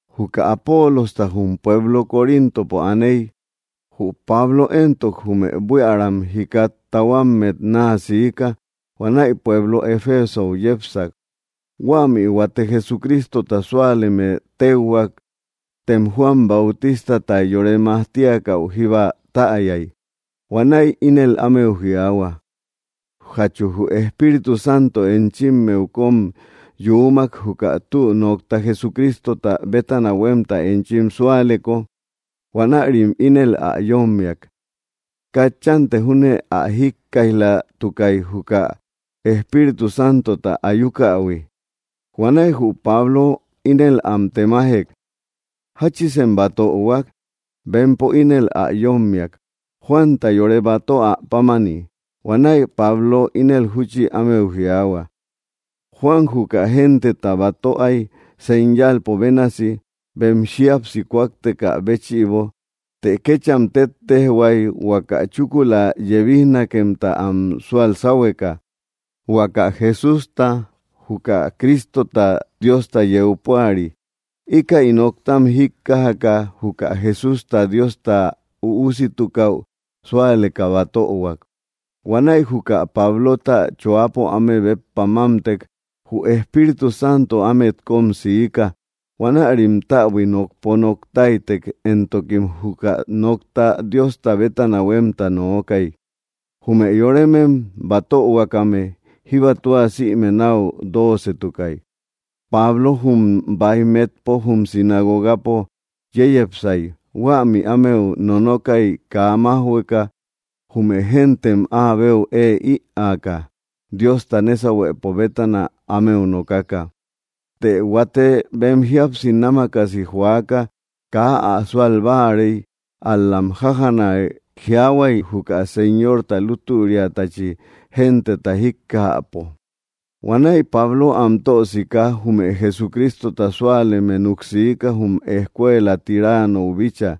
Juka Apolosta jum pueblo Coríntopo ä aaney, jü Pablo éntok jume buiäram jikat tahuammet naa siika, huanäi pueblo Efesou yépsak. Huämi huate Jesucrístota súaleme téuhuak tem Juan Bautístata yore majtíakäu jíba täyai. Huanäi ínel ámeu jiaahua: —¿Jachu jü Espíritu Santo enchimmeu kom yuumak juka tü nokta Jesucrístota bétana huemta enchim súaleko? Huanärim ínel ä yommiak: —Katchante júne ä jíkkaij‑latukai juka Espíritu Santota ayúkähui. Huanäi jü Pablo ínel am temájek: —¿Jáchisem batöhuak? Bempo ínel ä yommiak: —Juanta yore batöa pámani. Huanäi Pablo ínel júchi ámeu jiaahua: —Juan juka genteta batöai señalpo bénasi bem jíapsi kúaktekä béchïbo. Të kécham tetejhuai huaka chúkula yebíjnakëmta am súal sáhueka, huaka Jesústa, juka Crístota Diosta yeu púari. Íkäi nóktam jíkkajaka, juka Jesústa Diosta üúsitukäu súaleka batöhuak. Huanäi juka Pablota choápo áme béppa mámtek, jü Espíritu Santo ámet kom siika. Huanärim täbui nokpo noktáitek, éntokim juka nokta Diosta bétana huemta nookai. Jume yorémem batöhuakame jíba tua sïme nau dócetukai. Pablo jum baij metpo jum sinagogapo yéyepsai. Huämi ámeu nonokai kaa májhueka, jume géntem áabeu ée ïaaka Diosta nésahuëpo bétana ámeu nokaka. Të huate bem jíapsi námakasi joaka kaa ä súal báarei, al‑lam jájana jiaahuai juka Señorta lútüriatachi genteta jíkkajäpo. Huanäi Pablo am tösika, jume Jesucrístota súaleme nuk siika jum escuela Tiránnou bícha.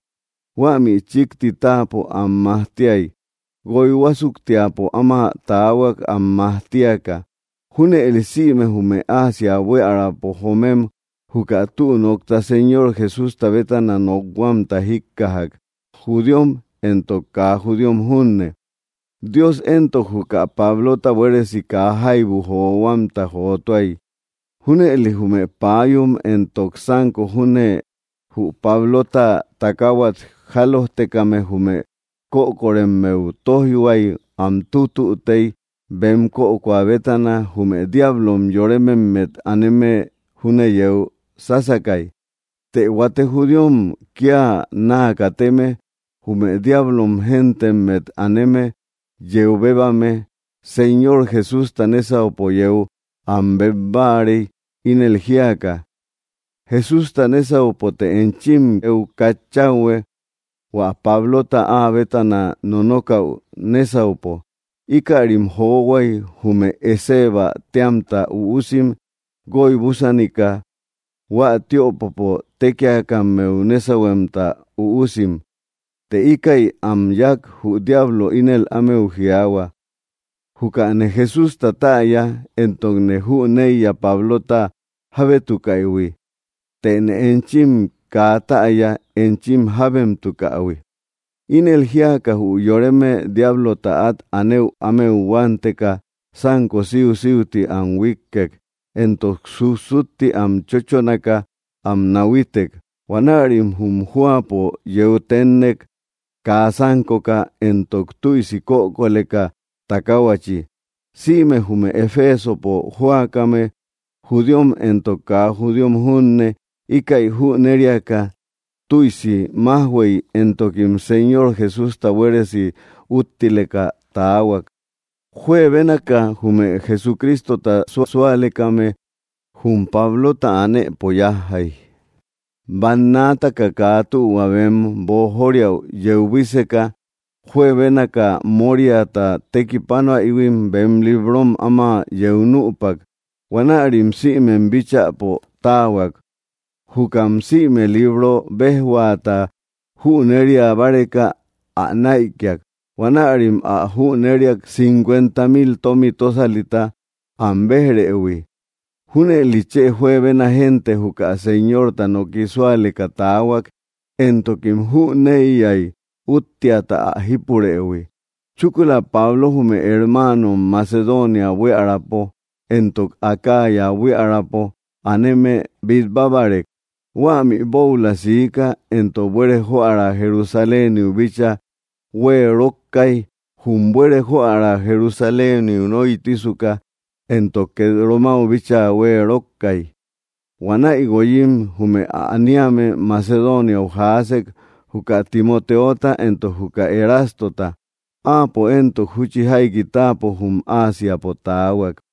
Huámi chikti táapo am majtíai. Guoi huásuktiapo áma taahuak am majtíaka. Junëli sïme jume Asia buíaräpo joomem juka tü nokta Señor Jesústa bétana nokhuamta jíkkajak, judíom éntok kaa judíom junne. Dios éntok, juka Pablota buéresi kaa jaibu johuamta jotúai. Júnëli jume páayum éntok sanko júne jü Pablota takáhuat jálojtekame jume kökoremmeu tóijhuay, am tutütey, bem kökoa bétana, jume diáblom yorememmet aneme júne yeu sásakay. Të huate judíom kia naa kateme, jume diáblom géntemmet aneme yeu bébame, Señor Jesústa nésaupo yéu am beb báarei ínel jíaka: —Jesústa nésaupote enchim yeu katchauhue, hua Pablota áa bétana nonókáu nésaupo. Íkärim johuai jume Escevä téamta üusim guoy búsanika, hua tiöpopo tékiakammeu nésauhuemta üusim. Të íkäi am yáak, jü diablo ínel ámeu jiaahua: —Jukane Jesústa täya, éntokne jüneiya Pablota jábétukäihui, tëne enchim kaa täya enchim jábemtukähui. Ínel jíaka, jü yoreme diáblota at anëu ámeu huánteka sanko síusiuti am huíkkek, éntok sussutti am chóchonaka am nahuítek. Huanärim jum jóapo yeu ténnek kaa sánkoka éntok tüisi kökoleka takáhuachi. Sïme jume Efesopo jóakame, judíom éntok kaa judíom junne, íkäi jüneriaka tüisi majhuëi, éntokim Señor Jesústa buéresi úttileka taahuak. Juebénaka jume Jesucrístota susualekame jum Pablota anëpo yajjai, bannaataka kaa tühua bem boojóriäu yeu buíseka. Juebénaka móriata tekipánoaïhuim bem librom áma yeu nüpak, huanärim sïmem bíchäpo táahuak. Jukam sïme libro béjhuata jünéria báreka ä näikiak. Huanärim ä jünériak cinkuenta mil tomi tósalita am béj‑rëhui. Júnëli chë juebena génte juka Señorta noki súaleka taahuak éntokim jüneiyai útteata ä jípurëhui. Chúkula Pablo jume hermáanom Macedonia buíaräpo éntok Acaya buíaräpo aneme bitbábarek, huämi boula siká éntok, buere joära Jerusaléniu bíchaa hueerokkai. Jum buere joära Jerusaléniu nóitisuka éntok, ket Romáu bíchaa hueerokkai. Huanäi guoyim jume ä aniame Macedóniau jaásek, juka Timotéota éntok juka Erástota. Áapo éntok, júchi jaiki táapo jum Áasiapo taahuak.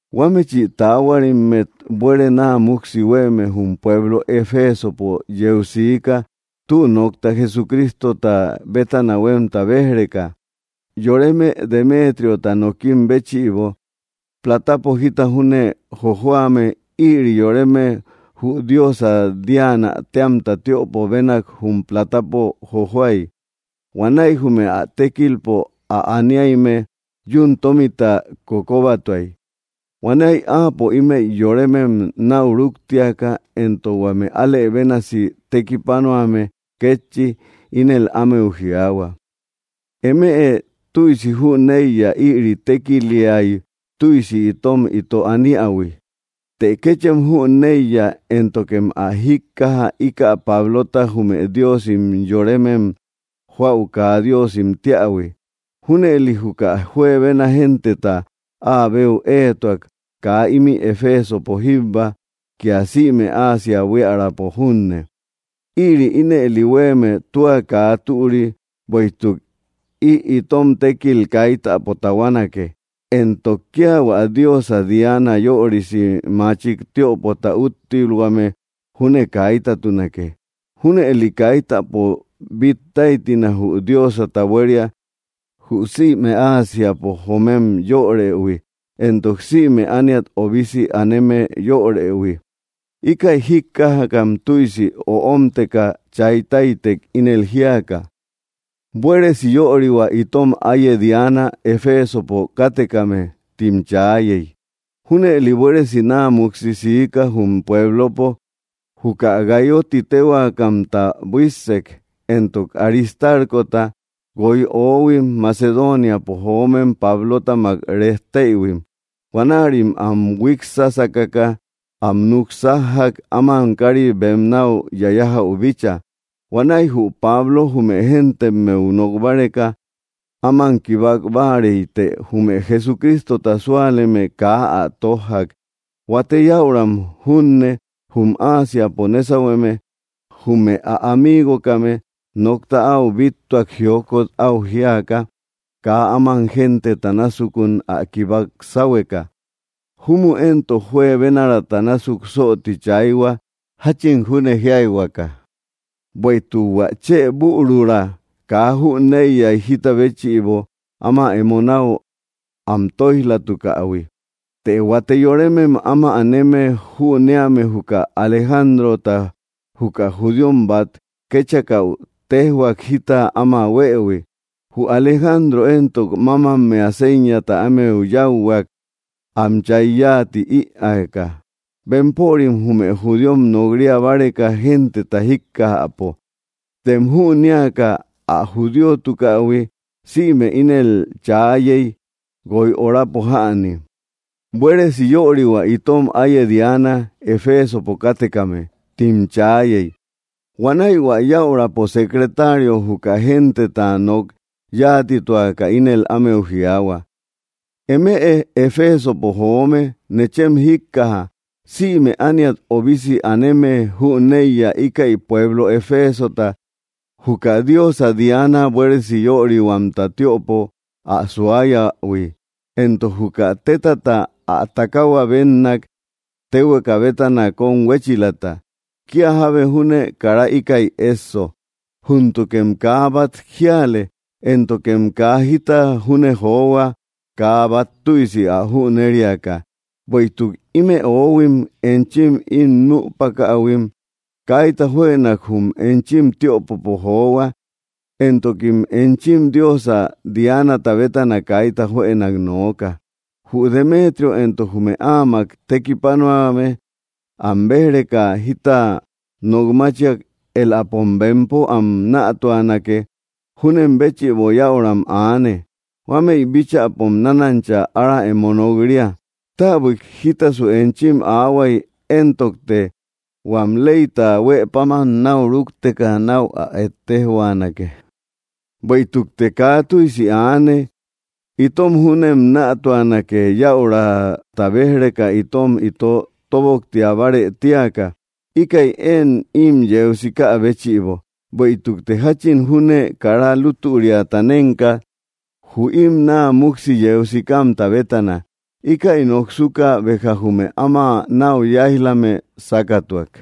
Huámechi taáhuarimmet buere naa muksi huéeme jum pueblo Efesopo yeu siika tü nokta Jesucrístota bétana huemta béj‑reka, yoreme Demétriota nokim béchïbo, platapo jita júne jojoame. Ïri yoreme jü diosa Diana téamta tiöpo bénak jum plátapo jojoai. Huanäi jume ä tékilpo ä aniayme yuun tómita kokobatuay. Huanäi áapo ímëi yoremem nau rúktiaka, éntok huame álë bénasi tekipanuame kétchi, ínel ámeu jiaahua: —Eme tüisi jüneiya ïri tékiliai tüisi itom ito aniähui. Të kéchem jüneiya, éntokem ä jíkkaja ika Páblota jume diósim yorémem joäu kaa diósim tíähui. Junëli juka juebena genteta áa beu éetua, kaa imi Efesopo jíbba, kia sïme Asia buíaräpo junne. Ïri ínëli huéeme tua kaa türi, bueïtuk ï itom tékil kaitäpo tahuánakë, éntok kia hua diosa Diana yörisi machik tiöpota úttilhuame júne kaítatunakë. Júnëli kaitäpo bittáitina jü diósata buéria, jü sïme Ásiapo joomem yörëhui, éntok sïme ániat öbisi aneme yörëhui. Íkäi jíkkajakam tüisi öómteka chaytáitek ínel jíaka: —¡Buéresi yörihua itom áiye Diana Efesopo káttekame! —tim chaayey. Júnëli buéresi naa muksi siika jum pueblopo. Juka Gáyo ti téhuakamta buíssek éntok Aristárkota, guoi oóhuim Macedóniapo joomem Pablótamak rejtéïhuim. Huanärim am huíksakaka am nuksájjak áman kari bem nau yayájäu bícha. Huanäi jü Pablo jume géntemmeu nok báreka áman kibák báarei, të jume Jesucrístota súaleme kaa ä tójjak. Huate yäuram junne jum Ásiapo nésauhueme, jume ä amígokame, nokta au bíttuak jiókot au jíaka kaa áman genteta násukun ä kibák sáhueka. Jumu éntok, juebénaraata násuk sooti chayhua jachin júne jíaka, bueïtuk hua chë bürura kaa jüneiyai jita béchïbo áma emo nau am tóij‑latukähui. Të huate yorémem áma aneme jünéame juka Alejándrota, juka judíom bat kéchakäu, téjhuak jita áma huëhui. Jü Alejandro éntok, mámammea séñata ámeu yáuhuak, am chay yánti ïaaka, bempörim, jume judíom, nok‑ria báreka genteta jíkkajäpo. Tem jünéaka ä judíotukähui, sïme ínel chaayey, guoi orapo jäni: —¡Buéresi yörihua itom áiye Diana Efesopo káttekame! —tim chaayey. Huanäi hua yäurapo secretario juka genteta nok yáatituaka ínel ámeu jiaahua: —Eme Efesopo joome, nechem jíkkaja. Sïme ániat öbisi aneme jüneiya íkäi pueblo Efésota juka diosa Diana buéresi yörihuamta tiöpo ä suáyähui, éntok juka tétata ä takahua bénnak téhueka bétana kom huéchilata. Kia jábe júne kara íkäi esso. Júntukem kaa bat jíale, éntokem kaa jita júne johua kaa bat tüisi ä jünériaka. Bueïtuk ime oóhuim enchim im nüpakähuim kaita juënak jum enchim tiöpopo johua, éntokim enchim diosa Diánata bétana kaita juënak nooka. Jü Demetrio éntok jume áamak tekipánoame am béj‑reka jita nokmáchiak, éläpom, bempo, am nätuanakë; júnen béchïbo yäuram aane. Huámëi bíchäpom nánancha ára emo nok‑ria. Táabuik jítasu enchim aahuai éntokte huam leyta huë páman nau rúkteka nau ä ettéjhuanakë. Bueïtukte kaa tüisi aane. Itom júnem nätuanake yäurata béj‑reka itom ito toboktiabárë tíaka, íkäi én im yeu sikä béchïbo. Bueïtukte jachin júne kara lútüriata nenka jü im naa muksi yeu sikamta bétana. Íkäi noksuka, béja jume áma nau yáij‑lame sákatuak.